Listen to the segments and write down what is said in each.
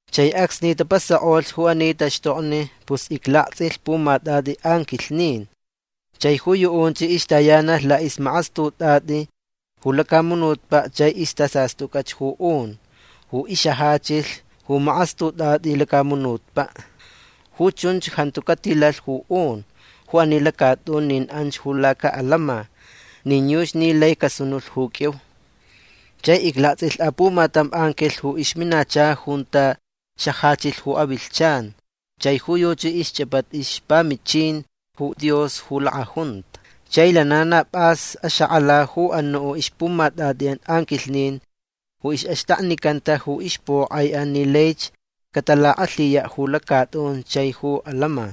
Chai acsni tapasakʼolh ju ani taxtokni pus iclaktsʼilh pumatʼatʼi anquilhnin. Chai ju yuʼunch ixtayanalh laʼixmakastutʼatʼi ju lacamunutpaʼ chai istasastʼucʼach ju un ju ixajachilh ju makastutʼatʼi ju lacamunutpaʼ. Ju chunch jantu catilalh ju un ju ani lacatʼun nin anch ju lacaʼalama nin yuchi ni lai casunulh ju qʼuiu. Chai iclaktsʼilh apumatam anquilh ju ixminacha junta xajachilh ju avilhchan. Chai ju yuchi ixchʼapata ixpamichin ju Dios ju lakʼajunta. Chai lana na pʼas axakʼala ju anuʼ ixpumatʼatʼiʼan anquilhnin ju ixʼaxtaknicanta ju ixpokʼaiʼan ni laich catalakʼalhiyaʼ ju lacatʼun chai ju alama.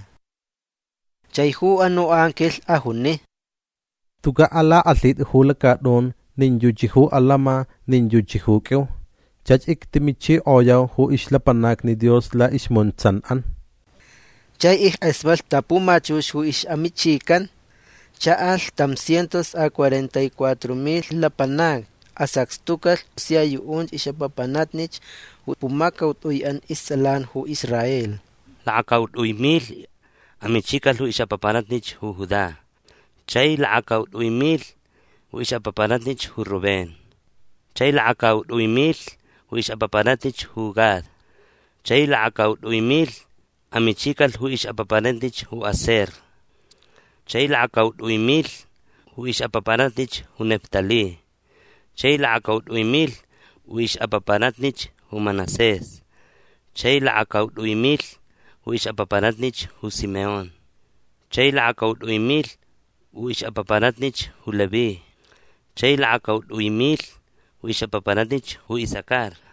Chai ju anuʼ anquilh ajuni: ―Tucaʼ alakʼalhitʼit ju lacatʼun nin yuchi ju alama nin yuchi ju qʼuiu. Chach ictimichikʼoyau ju ixlapanacni Dios laʼismuntsanʼan. Chai ickʼasmatlh ta pumachux ju ixʼamichican. Chaʼalh tam cientos a cuarenta y cuatro milh lapanacni. Asacxtucalh sia yuʼunch ixʼapapanatnich ju pumacautʼuiʼan istsʼalan ju Israel. Lakacautʼui milh amichicalh ju ixʼapapanatnich ju Judá. Chai lakacautʼui milh ju ixʼapapanatnich ju Rubén. Chai lakacautʼui milh ju ixʼapapanatnich ju Gad. Chai lakacautʼui milh amichicalh ju ixʼapapanatnich ju Aser. Chai lakacautʼui milh ju ixʼapapanatnich ju Neftalí. Chai lakacautʼui milh ju ixʼapapanatnich ju Manasés. Chai lakacautʼui milh ju ixʼapapanatnich ju Simeón. Chai lakacautʼui milh ju ixʼapapanatnich ju Leví. Chai lakacautʼui milh ju ixʼapapanatnich ju Isacar.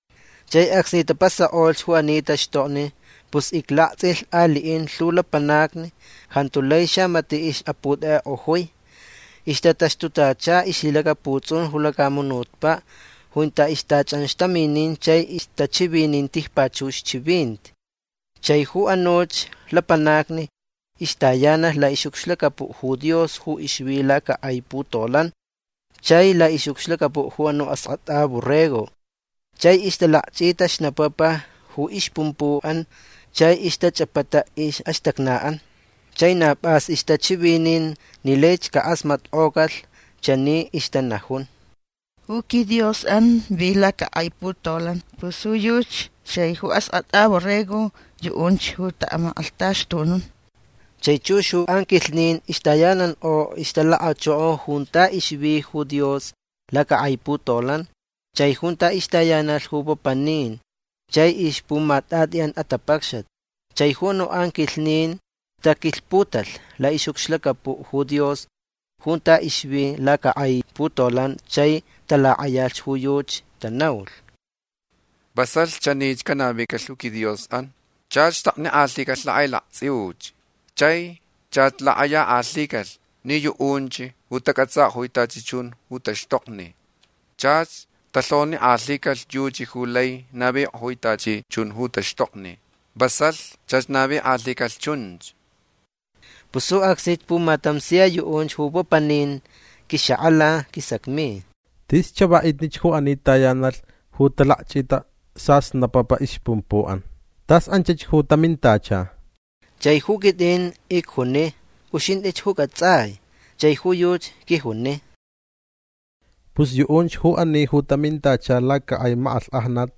Chai acsni tapasakʼolh ju ani taxtokni pus iclaktsʼilh aliʼin lhu lapanacni. Jantu lai xamatiʼ ixʼaputʼekʼekʼojui. Ixtataxtutacha ixlhilacaputsʼun ju lacamunutpaʼ junta ixtachʼanxtaminin chai ixtachivinin tijpachux chivinti. Chai ju anuch lapanacni ixtayanalh laʼixʼucxlacapuʼ ju Dios ju ixvi lacakʼai putolan chai laʼixʼucxlacapuʼ ju anuʼ Askʼatʼa Borrego. Chai ixtalakchʼita xnapapa ju ixpumpuʼan chai ixtachʼapata ixʼaxtacnaʼan. Chai na pʼas ixtachivinin ni laich cakʼasmatkʼocalh. Chani ixtanajun: Ju quiDiosʼan vi lacakʼai putolan. Pus ju yuchi chai ju Askʼatʼa Borrego yuʼunch ju taʼamakʼalhtaxtunun. Chai chux ju anquilhnin ixtayanankʼo ixtalakachoko junta ixvi ju Dios lacakʼai putolan chai junta ixtayanalh ju papanin chai ixpumatʼatʼiʼan atapacxat. Chai ju anuʼ anquilhnin tataquilhputalh laʼixʼucxlacapuʼ ju Dios junta ixvi lacakʼai putolan chai talakʼayalh ju yuchi. Tanaulh: Vasalh chanich canavicalh ju quiDiosʼan. Chach xtaknikʼalhicalh lakʼailaktsʼiuch. Chai chach lakʼayakʼalhicalh ni yuʼunch ju tacʼatsakʼojui tachi chun ju taxtokni. Chach talhonikʼalhicalh yuchi ju lai navikʼojui tachi chun ju taxtokni. Vasalh chach navikʼalhicalh chunch. Pus ju acsnich pumatam sia yuʼunch ju papaninch quixakʼala. Quisacmi: ―Tis chavaʼitnich ju ani tayanalh ju talakchʼita sasnapapa ixpumpuʼan. Tas anchach ju tamintacha. Chai ju quitʼin icjuni: ―Uxintʼich ju cʼatsʼai. Chai ju yuchi quijuni: ―Pus yuʼunch ju ani ju tamintacha lacakʼai makʼalhkʼajnat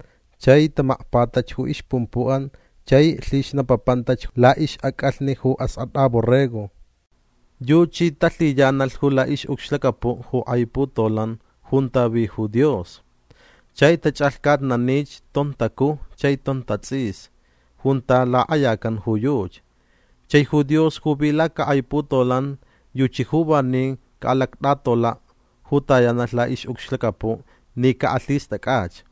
chai tamakpatach ju ixpumpuʼan chai lhixnapapantach laʼixʼacʼalhni ju Askʼatʼa Borrego. Yuchi talhiyanalh ju laʼixʼucxlacapuʼ ju kʼai putolan junta vi ju Dios. Chai tachʼalhcatnanich tontacuj chai tontatsʼis junta lakʼayacan ju yuchi. Chai ju Dios ju vi lacakʼai putolan yuchi ju vanin caʼalactʼatolaʼ ju tayanalh laʼixʼucxlacapuʼ ni caʼalhistʼacʼach.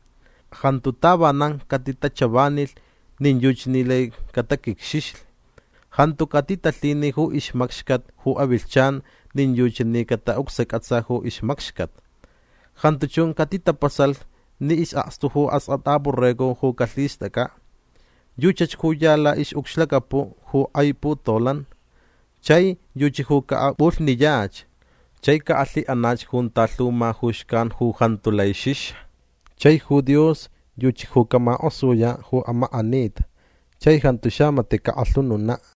Jantu tavanan catitachavanilh nin yuchi ni lai cataquicxixli. Jantu catitalhini ju ixmacxcat ju avilhchan nin yuchi ni cataʼucsacʼatsa ju ixmacxcat. Jantu chun catitapasalh ni isʼakstu ju Askʼatʼa Borrego ju calhistʼacʼaʼ. Yuchach ju ya laʼixʼucxlacapuʼ ju kʼai putolan. Chai yuchi ju caʼapʼulhniyach. Chai caʼalhiʼanach junta lhu ma ju xcan ju jantu lai xixa. Chai ju Dios yuchi ju camakʼosuyaʼ ju amakʼanita chai jantu xamatiʼ cakʼalhununaʼ.